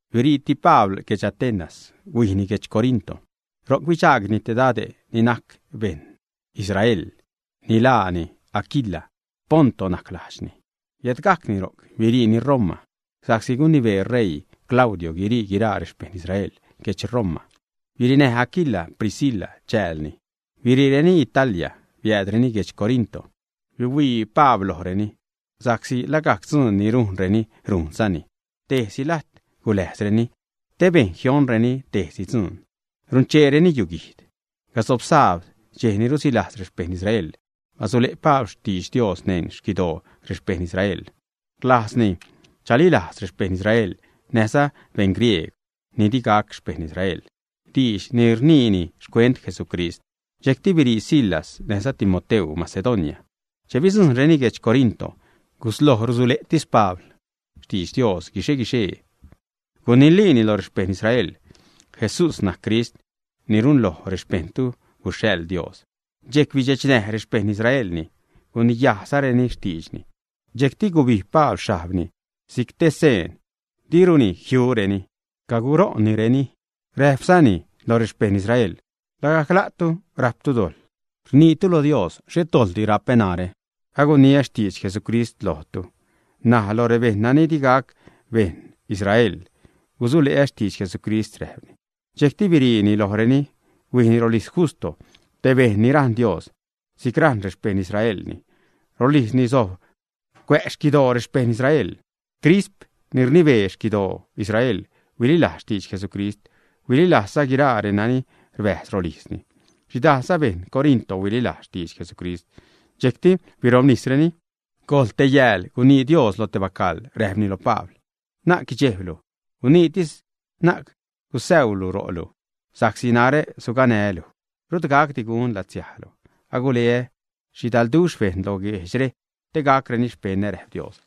Biriiti Pabl guedx Atenas, huijni guedx Corinto. Ro'c bidxaagni te dade' ni najc beṉ Israel, ni laani Aquila. Ponto najc lajdxni. Biädgajni ro'c, biriini Roma, sa'csi gunibee ṟeii Claudio guirii guiraa rexpejṉ Israel guedx Roma. Birinäj Aquila Priscila chäälni. Biriireni Italia, biäädreni guedx Corinto. Bihuii Pablreni, sa'csi lagajc dzuun ni rujnreni rujnzani. Tejsi lajt guläjzreni te bejn jioṉreni tejsi dzuun. Runcheereni yuguijd. Gasob sabd, dxej ni rusilajz rexpejṉ Israel, basule' Pabl xtidx Dios neṉ xquidoo rexpejṉ Israel. Rlajzni chalilajz rexpejṉ Israel näjza beṉ griegw ni digac xpejṉ Israel diidx ni rniini xcuent Jesucrist. Dxejcti birii Silas näjza Timoteu Macedonia. Che bidzujṉreni guedx Corinto, gusloj rusule'tis Pabl xtidx Dios guixe-guixee, guniliini lo rexpejṉ Israel: ―Jesús najc Crist ni runloj rexpejṉtu guxhaḻ Dios. Dxejc bidxechnäj rexpejṉ Israelni, guniyajzareni xtiidxni. Dxejcti gubijb Pabl xhajbni si'c te seen diruni jiureni, caguṟo'nnireni. Räjpzani lo rexpejṉ Israel: ―Lagajc la'tu rajptu dojḻ nittu lo Dios. Xhet dojḻdi rapä narä. Aguniä xtidx Jesucrist lojtu. N̲aj lo rebejṉ nani di gac beṉ Israel gusule'ä xtidx Jesucrist ―räjpni. Dxejcti biriini lojreni, huijni rolijz Justo, te bejṉ ni rajṉ Dios si'c rajṉ rexpejṉ Israelni. Rolijzni sojb cuä' xquidoo rexpejṉ Israel. Crisp, ni rnibee xquidoo Israel, huililajz xtidx Jesucrist. Huililajzza guiraa reni rbäjz rolijzni. Xhidajlza beṉ Corinto huililajz xtidx Jesucrist, dxejcti birobnisreni. Gojḻ te yääl gunii Dios lo te bacaḻ, räjpni lo Pabl: ―Na'c guidxejblu. Guniitis, na'c gusäulu ro'lu, sa'csi narä suganää́ luj. Rut gacdi gun latsiajlu. Aguleä xhidalduxh bejṉ lo guejdxre te gacreni xpeṉä ―räjp Dios.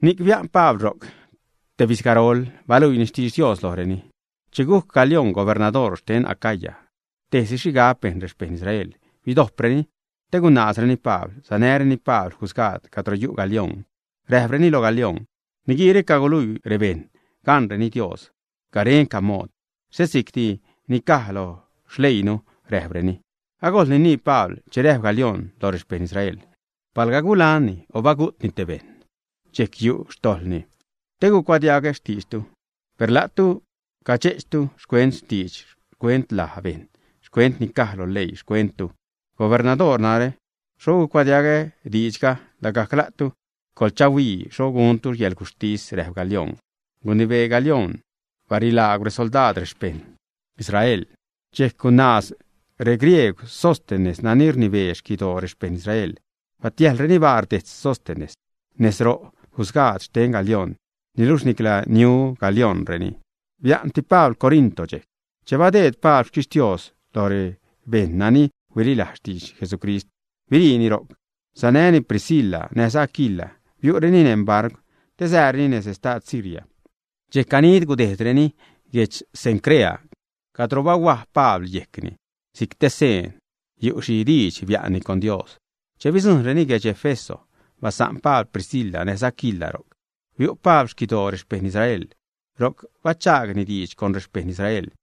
Ni'c bia'n Pabl ro'c tebizgarol. Baluiini xtidx Dios lojreni. Che gujc Galíon gubernadoor xten Acaya, tejsi xhigab bejn rexpejṉ Israel bidojpreni te gunaazreni Pabl. Sanäreni Pabl jusgaad cadro yu' Galíon. Räjpreni lo Galíon: ―Niguiire caguluii rebejṉ gaṉreni Dios garenca mood, xhet si'cti ni caj lo xleiinu ―räjpreni. Agojl ninii Pabl, che räjp Galíon lo rexpejṉ Israel: ―Palga gulanni o bagu'tni te bejṉ, dxejc yu' xtojḻni te gucuadiagä xtiidxtu. Per la'tu cadxe'chtu xcuent diidx, xcuent laj bejṉ, xcuent ni caj lo leii xtentu. Gubernadoor narä, xho gucuadiagä diidxga. Lagajc la'tu coḻchahuii xho guntu yälguxhtis ―räjp Galíon. Gunibee Galíon barilaagw resoldaad rexpejṉ Israel. Dxejc gunaaz reGriegw Sóstenes nani rnibee xquidoo rexpejṉ Israel. Batiäjḻreni baar dejtz Sóstenes nez ro' jusgaad xten Galíon. Niluxh nicla niu Galíonreni. Bia'nti Pabl Corinto xchej. Dxejc badeed Pabl xtixtios lo rebejṉ nani huililaz xtidx Jesucrist, biriini ro'c. Sanäni Priscila näjza Aquila, biu'reni neṉ barcw te siireni nez estad Siria. Dxejc ganid gudejdreni guedx Cencrea, cadro bahuaj Pabl yejcni si'c te seen yu' xhi diidx bia'nni con Dios. Che bidzujṉreni guedx Éfeso, basa'n Pabl Priscila näjza Aquila ro'c. Biu' Pabl xquidoo rexpejṉ Israel, ro'c bachaagni diidx con rexpejṉ Israel.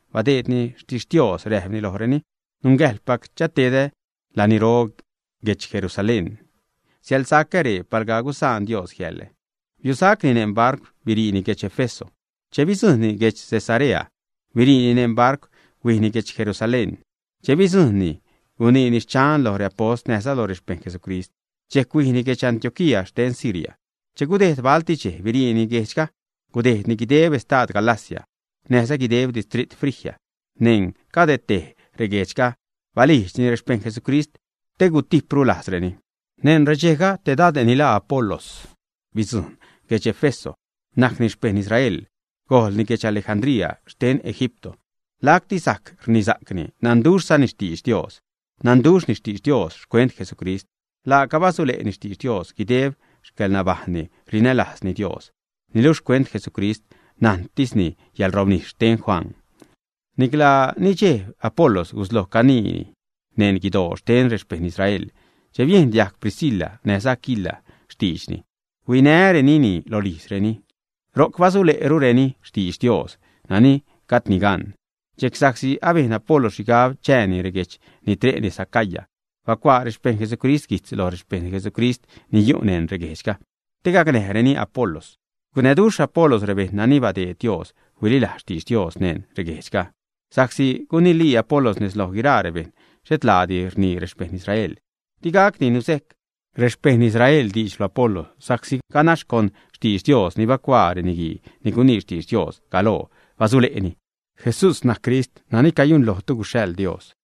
Badeedni xtixtios, räjpni lojreni: ―Nungäjḻpac chatedä laniro guedx Jerusalén. Siälsacä ree palga gusaan Dios jiälä. Biusacni neṉ barcw, biriini guedx Éfeso. Che bidzujṉni guedx Cesarea, biriini neṉ barcw, huijni guedx Jerusalén. Che bidzujṉni, guniini xchan lo reapost näjza lo rexpejṉ Jesucrist. Dxejc huijni guedx Antioquía xten Siria. Che gudejd balti dxej, biriini guejdxga, gudejdni guideb estad Galacia näjza guideb distrit Frigia. Neṉ cade tej reguejdxga, balijdxni rexpejṉ Jesucrist te gutijpru lajzreni. Neṉ redxejga, te dade' ni laa Apolos bidzujṉ guedx Éfeso. Najcni xpejṉ Israel, gojlni guedx Alejandría xten Egipto. Lacti rajc rnisa'cni, nanduxhzani xtidx Dios. Nanduxhni xtidx Dios xcuent Jesucrist. Laaca basule'ni xtidx Dios, guideb xcäḻnabajṉni rinälajzni Dios. Niluxh xcuent Jesucrist najntisni yäḻrobnis xten Juan. Nicla nidxejb Apolos gusloj caniini neṉ guidoo xten rexpejṉ Israel. Che biejn diajg Priscila näjza Aquila xtiidxni, huinärenini rolijzreni. Ro'c basule'rureni xtidx Dios nani gajdni gan. Dxejc, sa'csi abejn Apolos xhigab chääni reguejdx ni tre' nez Acaya, bacuaa rexpejṉ Jesucrist guijtz lo rexpejṉ Jesucrist ni yu' neṉ reguejdxga te gacnäjreni Apolos. Gucnäduxh Apolos rebejṉ nani badeed Dios huililajz xtidx Dios neṉ reguejdxga, sa'csi gunilii Apolos nez loj guiraa rebejṉ xhet laadi rnii rexpejṉ Israel. Di niajcdi nuzejc rexpejṉ Israel diidx lo Apolos sa'csi ganax con xtidx Dios ni bacuaa reniguii ni gunii xtidx Dios galoo basule'ni: “Jesús najc Crist nani cayunlojtu guxhaḻ Dios.”